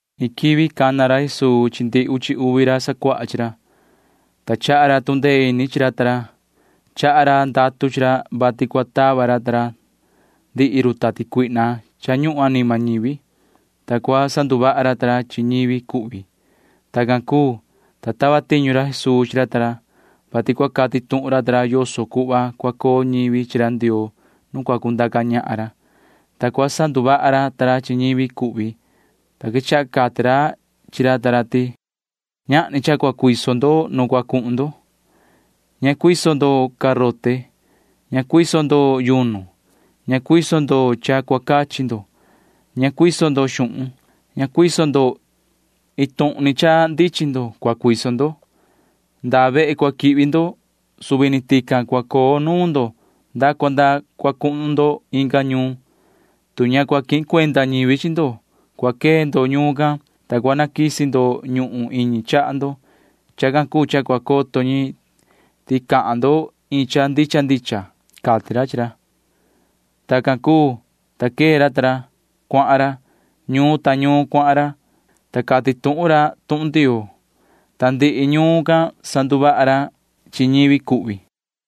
Iin quivi cana ra Jesuu chi ndihi uchi uvi ra sacuaha chi ra, ta chaha ra tu ndee ini chi ra ta ra. Chaha ra ndatu chi ra, vati cua tava ra ta ra ndihi run tati cuihna cha ñuhun anima ñivi, ta cua sanduvaha ra ta ra chi ñivi cuhvi. Tacan cuu, ta tava tiñu ra Jesuu chi ra ta ra, vati cua cati tuhun ra ta ra yoso cuhva cua coo ñivi chi ra Ndioo nu cua cundaca ñahan ra, ta cua sanduvaha ra ta ra chi ñivi cuhvi, ta quechaha cati ra chi ra ta ra ti: ―Ñahni cha cua cuiso ndo nu cua cuhun ndo. Ña cuiso ndo garote. Ña cuiso ndo yunu. Ña cuiso ndo cha cua cachi ndo. Ña cuiso ndo xuhun. Ña cuiso ndo. Iin tuhun ni cha ndichin ndo cua cuiso ndo. Ndaa vehe cua quihvi ndo ―suvi ni tican cua coo nuun ndo nda cua nda cua cuhun ndo inga ñuun. Tu ña cua quihin cuenda ñivi chi ndo, cua quee ndo ñuun can, ta cua naquisi ndo ñuhun iñi chaha ndo. Chacan cuu cha cua coto ñi ti cahan ndo iin cha ndicha ndicha ―cati ra chi ra. Tacan cuu, ta quee ra ta ra. Cuahan ra. Ñuun ta ñuun cuahan ra, ta cati tuhun ra tuhun Ndioo, ta ndihi ñuun can sanduvaha ra chi ñivi cuhvi.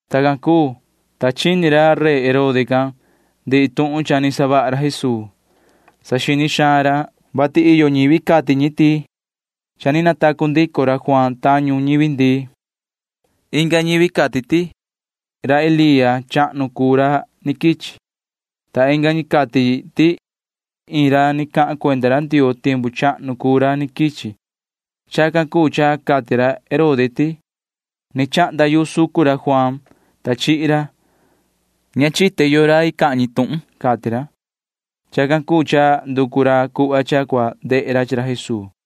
Tacan cuu, ta chini ra Herode rey can ndihi tuhun cha ni savaha ra Jesuu. Saxini xaan ra, vati iyo ñivi cati ñi ti cha ni natacu ndico ra Juaan tañu ñivi ndii. Inga ñivi cati ti ra Elía chahnu cuu ra ni quichi, ta inga ñi cati ti iin ra ni cahan cuenda ra Ndioo tiempu chahnu cuu ra ni quichi. Chacan cuu cha cati ra Herode ti: ―Ni chahnda yu sucun ra Juaan, [ta chihi ra]. Ña chite yoo rai cahan ñi tuhun can ―cati ra. Chacan cuu cha nducu ra cuhva cha cua ndehe ra chi ra Jesuu.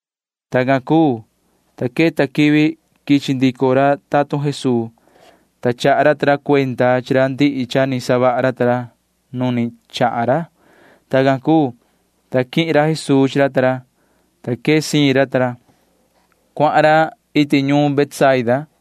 Tacan cuu, ta queta quivi quichi ndico ra tatun Jesuu, ta chaha ra ta ra cuenda chi ra ndihi cha ni savaha ra ta ra nu ni chahan ra. Tacan cuu, ta quihin ra Jesuu chi ra ta ra, ta quee siin ra ta ra. Cuahan ra iti ñuun Betsaida,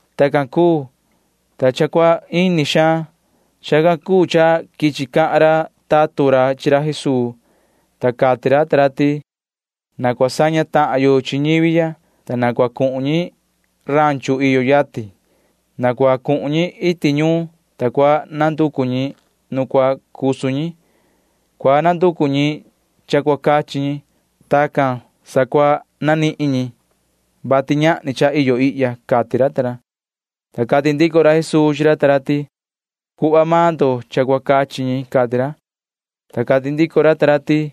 Tacan cuu, ta cha cua ini xaan. Chacan cuu cha quichi cahan ra tatun ra chi ra Jesuu, ta cati ra ta ra ti: ―Na cua saña tahan yo chi ñivi ya, ta na cua cuhun ñi ranchu iyo yatin. Na cua cuhun ñi iti ñuun, ta cua nanducu ñi nu cua cusu ñi. Cua nanducu ñi cha cua cachi ñi. Tacan sa cua nanihin ñi, vati ñahni cha iyo ihya ―cati ra ta ra. Ta cati ndico ra Jesuu chi ra ta ra ti: ―Cuhva maan ndo cha cua cachi ñi ―cati ra. Ta cati ndico ra ta ra ti: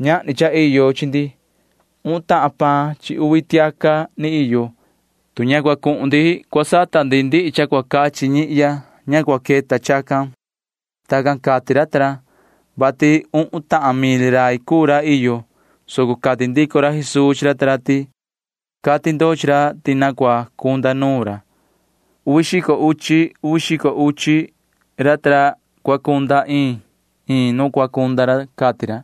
―Ñahni cha iyo chi ndi. Uhun tahan paan chi uvi tiaca ni iyo. Tu ña cua cuhun ndi cu sata ndi cha cua cachi ndihi ñihya, ña cua queta chacan. Tacan cati ra ta ra, vati uhun tahan mil rai cuu ra iyo, soco cati ndico ra Jesuu chi ra ta ra ti: ―Cati ndo chi ra ti na cua cunda nuun ra. Uvi xico uchi uvi xico uchi ra ta ra cua cunda iin iin nu cua cunda ra ―cati ra.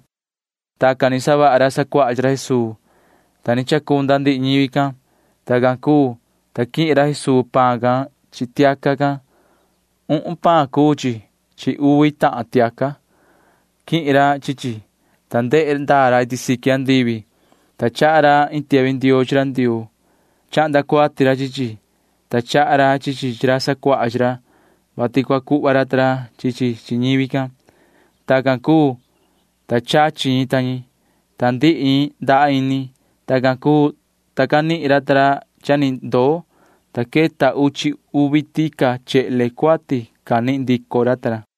Tacan ni savaha ra sacuaha chi ra Jesuu, ta ni chacunda ndihi ñivi can. Tacan cuu, ta quihin ra Jesuu paan can chi tiaca can. Uhun paan cuu chi chi uvi tahan tiaca. Quihin ra chi chi, ta ndehe ndaa ra iti siqui andivi, ta chaha ra iin tiahvi ndioo chi ra Ndioo. Chahnda cuati ra chi chi, ta chaha ra chi chi chi ra sacuaha chi ra, vati cua cuhva ra ta ra chi chi chi ñivi can. Tacan cuu, ta chachi ñi ta ñi, ta ndihi ñi ndaha ini. Tacan cuu, ta canihin ra ta ra cha ni ndoo, ta queta uchi uvi tica chehle cuati canihin ndico ra ta ra.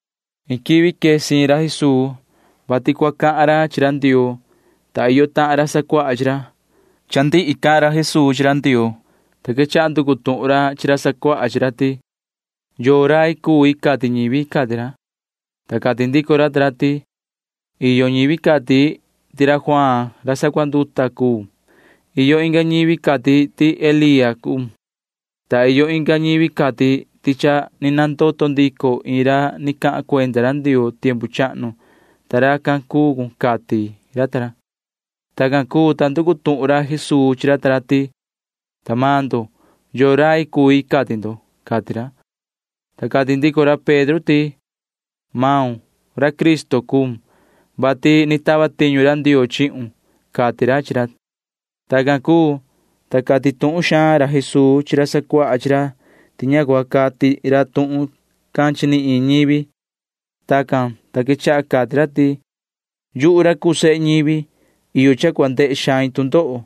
Iin quivi quee siin ra Jesuu, vati cua cahan ra chi ra Ndioo, ta iyo tahan ra sacuaha chi ra. Cha ndihi cahan ra Jesuu chi ra Ndioo, ta quechaha nducu tuhun ra chi ra sacuaha chi ra ti: ―¿Yoo rai cui cati ñivi? ―cati ra. Ta cati ndico ra ta ra ti: ―Iyo ñivi cati ti ra Juaan ra sacunduta cuun. Iyo inga ñivi―cati ñi ti Elía cuun, ta iyo inga ñi cati ti cha ni nandoto ndico iin ra ni cahan cuenda ra Ndioo tiempu chahnu, ta racan cuun ―cati ra ta ra. Tacan cuu, ta nducu tuhun ra Jesuu chi ra ta ra ti: ―Ta maan ndo, ¿yoo rai cui cati ndo? ―cati ra. Ta cati ndico ra Pedro ti: ―Yoho―ra Cristo cuun, vati ni tava tiñu ra Ndioo chihun ―cati ra chi ra. Tacan cuu, ta cati tuhun xaan ra Jesuu chi ra sacuaha chi ra ti ña cua cati ra tuhun can chi ni iin ñivi. Tacan, ta quechaha cati ra ti: ―Yuhu ra cuu sehe ñivi―iyo cha cua ndehe xain tu ndoho.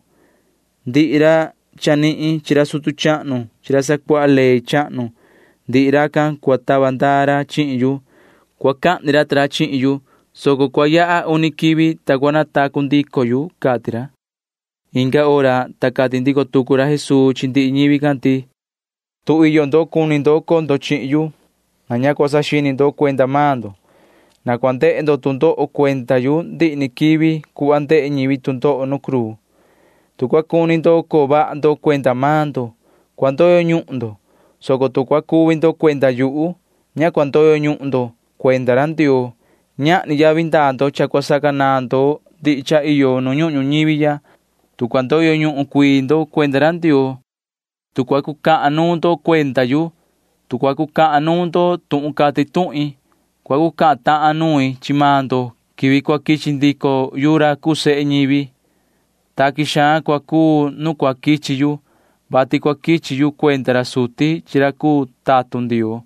Ndihi ra chanihin chi ra sutu chahnu chi ra sacuaha ley chahnu―ndihi racan cua tava ndaa ra chihin yu. Cua cahni ra ta ra chihin yu, soco cua yaha uni quivi, ta cua natacu ndico yu ―cati ra. Inga hora, ta cati ndico tucu ra Jesuu chi ndihi ñivi can ti: ―Tu iyo ndo cuni ndo coo ndo chihin yu, na ña cua saxini ndo cuenda maan ndo. Na cua ndehe ndo tu ndoho cuenda yu ndihi ni quivi cuhva ndehe ñivi tu ndoho nu cruu. Tu cua cuni ndo coo vaha ndo cuenda maan ndo, cua ndoyo ñuhun ndo, soco tu cua cuvi ndo cuenda yuhu, ña cua ndoyo ñuhun ndo cuenda ra Ndioo. Ñahni yavi ndaa ndo cha cua sacanaan ndo ndihi cha iyo nu ñuhun ñuñivi ya, tu cua ndoyo ñuhun cuii ndo cuenda ra Ndioo. Tu cua cucahan nuun ndo cuenda yu, tu cua cucahan nuun ndo tuhun cati tuhin, cua cucahan tahan nuin chi maan ndo quivi cua quichi ndico yu ra cuu sehe ñivi. Taqui xaan cua cuu nu cua quichi yu, vati cua quichi yu cuenda ra suti chi ra cuu tatun Ndioo.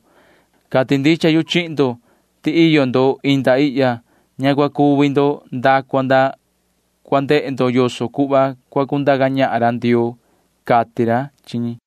Cati ndicha yu chihin ndo ti iyo ndo inda ihya―ña cua cuvi ndo nda cua nda cua ndehe ndo yoso cuhva cua cundaca ñahan ra Ndioo ―cati ra chi ñi.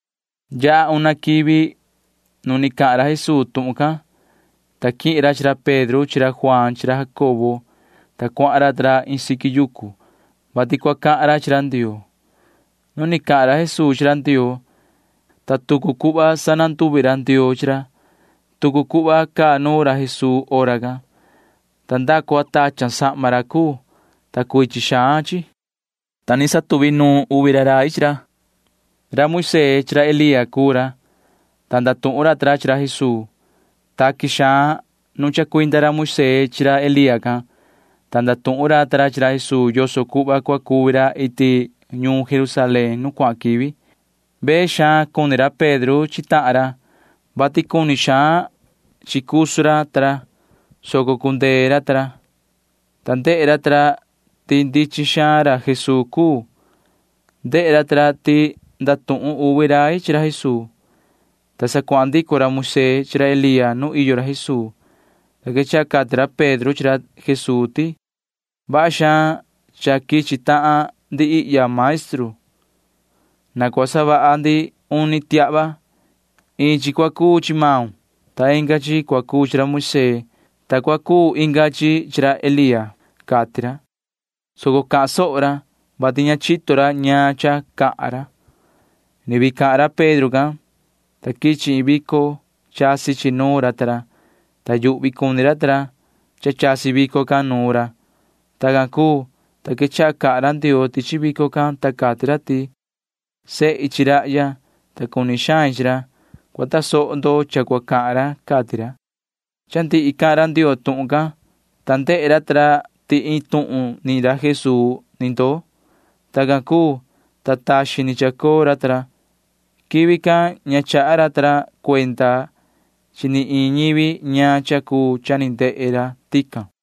Yaha una quivi nu ni cahan ra Jesuu tuhun can, ta quihin ra chi ra Pedro chi ra Juaan chi ra Jacobo, ta cuahan ra ta ra iin siqui yucu, vati cua cahan ra chi ra Ndioo. Nu ni cahan ra Jesuu chi ra Ndioo, ta tucu cuhva sananduvi ra Ndioo chi ra. Tucu cuhva caa nuun ra Jesuu hora can, ta nda cua tachan sahma ra cuu, ta cuichin xaan chi, ta ni chacoo uvi rai chi ra. Ra Moisee chi ra Elía cuu ra, ta ndatuhun ra ta ra chi ra Jesuu. Taqui xaan nu chacuinda ra Moisee chi ra Elía can, ta ndatuhun ra ta ra chi ra Jesuu yoso cuhva cua cuvi ra iti ñuun Jerusalén nu cuahan quivi. Vee xaan cuni ra Pedro chi tahan ra, vati cuni xaan chi cusu ra ta ra, soco cundee ra ta ra, ta ndehe ra ta ra ti ndichin xaan ra Jesuu cuu. Ndehe ra ta ra ti ndatuhun uvi rai chi ra Jesuu, ta sa cuahan ndico ra Moisee chi ra Elía nu iyo ra Jesuu, ta quechaha cati ra Pedro chi ra Jesuu ti: ―Vaha xaan cha quichi tahan ndi ihya, maestru. Na cua savaha ndi uni tiahva. Iin chi cua cuu chi maun, ta inga chi cua cuu chi ra Moisee, ta cua cuu inga chi chi ra Elía ―cati ra, [soco cahan soho ra,] vati ña chito ra ñaan cha cahan ra. Ni vii cahan ra Pedro can, ta quichi iin vico. Chasi chi nuun ra ta ra, ta yuhvi cuni ra ta ra cha chasi vico can nuun ra. Tacan cuu, ta quechaha cahan ra Ndioo tichi vico can, ta cati ra ti: ―Sehi chi rahya, ta cuni xain chi ra. Cua tasoho ndo cha cua cahan ra ―cati ra. Cha ndihi cahan ra Ndioo tuhun can, ta ndehe ra ta ra ti iin tuhun ni ra Jesuu ni ndoo. Tacan cuu, ta taxin ni chacoo ra ta ra. Quivi can ña chaha ra ta ra cuenda chi ni iin ñivi ñaan cha cuu cha ni ndehe ra tican.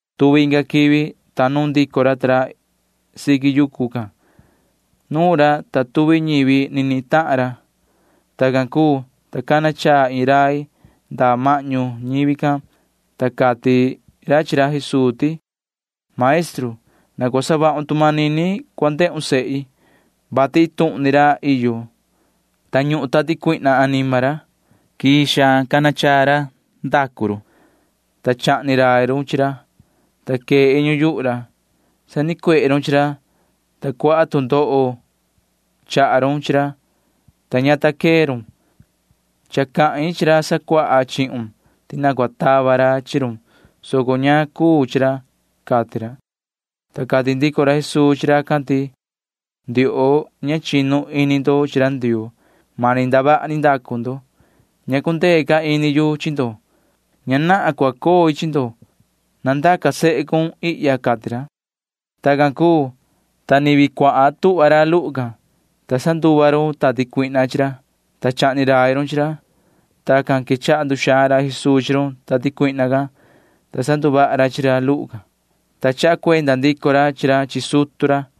Tuvi inga quivi, ta nuun ndico ra ta ra siqui yucu can. Nuun ra, ta tuvi ñivi ni nihin tahan ra. Tacan cuu, ta cana chaa iin rai nda mahñu ñivi can, ta cati ra chi ra Jesuu ti: ―Yoho maestru, na cua savahun tu manini cua ndehun sehi, vati iin tuhun ni ra iyo, ta ñuhun tati cuihna anima ra. Quii xaan cana chaa ra savaha run, ta chahni rai run chi ra, ta quee iñu yuhu ra. Sanicuehe run chi ra, ta cuaha tu ndoho chaha run chi ra, ta ña ta quee run. Cha cahin chi ra sacuaha chihun ti na cua tava ra chi run, soco ña cuu chi ra ―cati ra. Ta cati ndico ra Jesuu chi racan ti: ―Ndioho, ña chinu ini ndo chi ra Ndioo. Mani ndavaha ni ndacu ndo. Ña cundee ca ini yu chi ndo. Ña nahan cua coi chi ndo. Na ndaca sehe cun ihya ―cati ra. Tacan cuu, ta ni vii cua tuhva ra luhu can, ta sanduva run tati cuihna chi ra, ta chahni rai run chi ra. Tacan, ta quechaha nduxaan ra Jesuu chi run tati cuihna can, ta sanduvaha ra chi ra luhu, ta chaha cuenda ndico ra chi ra chi sutu ra.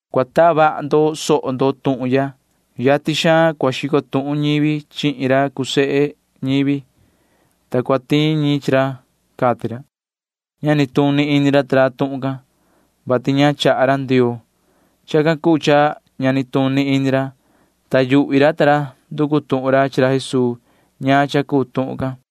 ―Cua taa vaha ndo soho ndo tuhun ya. Yatin xaan cua xico tuhun ñivi chihin ra cuu sehe ñivi, ta cua tiin ñi chi ra ―cati ra. Ña nituni ini ra ta ra tuhun can, vati ña chaha ra Ndioo. Chacan cuu cha ña nituni ini ra, ta yuhvi ra ta ra nducu tuhun ra chi ra Jesuu ñaan cha cuu tuhun can.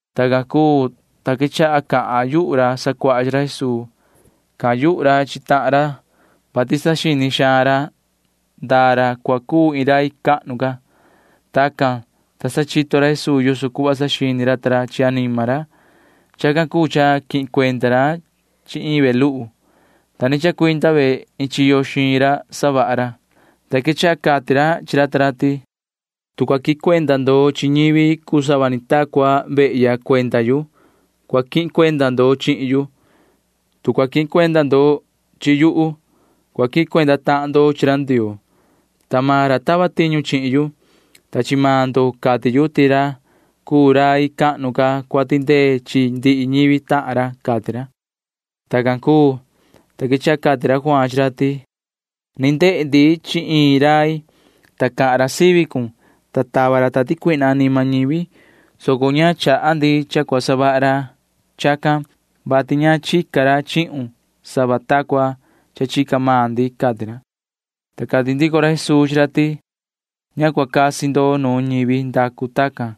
Tacan cuu, ta quechaha cahan yuhu ra sacuaha chi ra Jesuu. Cahan yuhu ra chi tahan ra, vati saxini xaan ra ndaa ra cua cuu iin rai cahnu ca. Tacan, ta sa chito ra Jesuu yoso cuhva saxini ra ta ra chi anima ra. Chacan cuu cha quihin cuenda ra chi iin ve luhu, ta ni chacuinda ve iin chiyo xiin ra savaha ra, ta quechaha cati ra chi ra ta ra ti: ―Tu cua quihin cuenda ndo chi ñivi cuu sava ni ta cua vehya cuenda yu, cua quihin cuenda ndo chihin yu. Tu cua quihin cuenda ndo chi yuhu, cua quihin cuenda tahan ndo chi ra Ndioo, ta maan ra tava tiñu chihin yu. Ta chi maan ndo cati yu ti ra cuu rai cahnu ca cua tindee chi ndihi ñivi tahan ra ―cati ra. Tacan cuu, ta quechaha cati ra Juaan chi ra ti: ―Ni ndehe ndi chi iin rai, ta cahan ra sivi cun, ta tava ra tati cuihna anima ñivi, soco ña chaha ndi cha cua savaha ca ra chacan, vati ña chica ra chihun sava ta cuhva cha chica maan ndi ―cati ra. Ta cati ndico ra Jesuu chi ra ti: ―Ña cua casi con nuun ñivi ndacu tacan,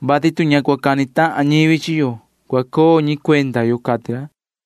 vati tu ña cua cani tahan ñivi chi yo, cua coo ñi cuenda yo ―cati ra.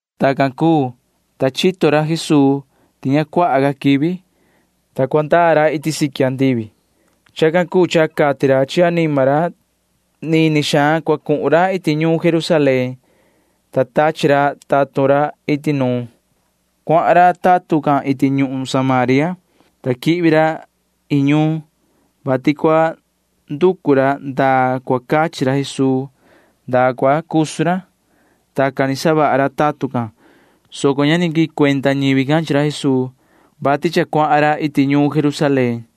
Tacan cuu, ta chito ra Jesuu ti ña cuaha ca quivi, ta cua ndaa ra iti siqui andivi. Chacan cuu cha cati ra chi anima ra ti nini xaan cua cuhun ra iti ñuun Jerusalén, ta tachi ra tatun ra iti nuun. Cuahan ra tatun can iti ñuhun Samaria, ta quihvi ra iin ñuun, vati cua nducu ra ndaa cua cachi ra Jesuu ndaa cua cusu ra. Tacan ni savaha ra tatun can, soco ña ni quihin cuenda ñivi can chi ra Jesuu, vati cha cuahan ra iti ñuun Jerusalén.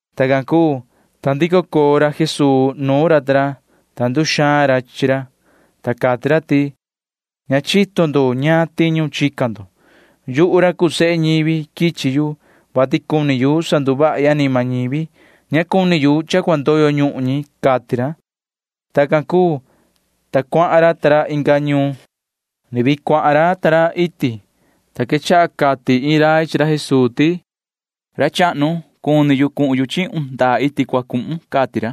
Tacan cuu, ta ndico coo ra Jesuu nuun ra ta ra, ta nduxaan ra chi ra, ta cati ra ti: ―Ña chito ndo ñaan tiñu chica ndo. Yuhu ra cuu sehe ñivi―quichi yu, vati cuni yu sanduvahi anima ñivi. Ña cuni yu cha cua ndoyo ñuhun ñi ―cati ra. Tacan cuu, ta cuahan ra ta ra inga ñuun. Ni vii cuahan ra ta ra iti, ta quechaha cati iin rai chi ra Jesuu ti: ―Yoho ra chahnu, cuni cuhin chihun ndaa iti cua cuhun cun ―cati ra.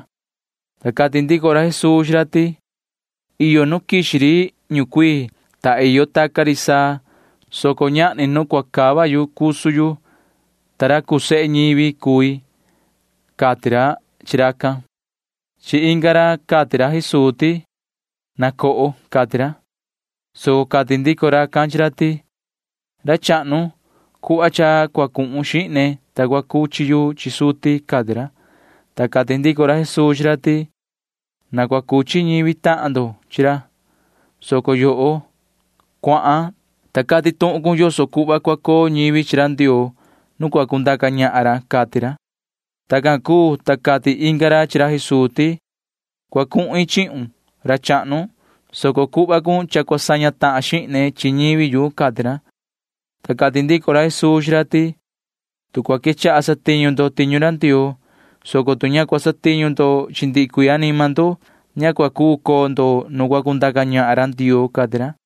Ta cati ndico ra Jesuu chi ra ti: ―Iyo nu quixi ri ñucuii, ta iyo taca ri saa, soco ñahni nu cua cava cusu yu, ta ra cuu sehe ñivi cui ―cati ra chi racan. Chi inga ra cati ra Jesuu ti: ―Na coho ―cati ra, soco cati ndico racan chi ra ti: ―Ra chahnu, cuhva cha cua cuhun xihne, ta cua cuchi yu chi suti ―cati ra. Ta cati ndico ra Jesuu chi ra ti: ―Na cua cuchi ñivi tahan ndo chi ra, soco yoho―cuahan, ta cati tuhun cun yoso cuhva cua coo ñivi chi ra Ndioo nu cua cundaca ñahan ra ―cati ra. Tacan cuu, ta cati inga ra chi ra Jesuu ti: ―Cua cuhin chihun, ra chahnu, soco cuhva cun cha cua saña tahan xihne chi ñivi yu ―cati ra. Ta cati ndico ra Jesuu chi ra ti: ―Tu cua quechaha satiñu ndo tiñu ra Ndioo, soco tu ña cua satiñu ndo chi ndihi cuii anima ndo, ña cua cuu coo ndo nu cua cundaca ñahan ra Ndioo ―cati ra.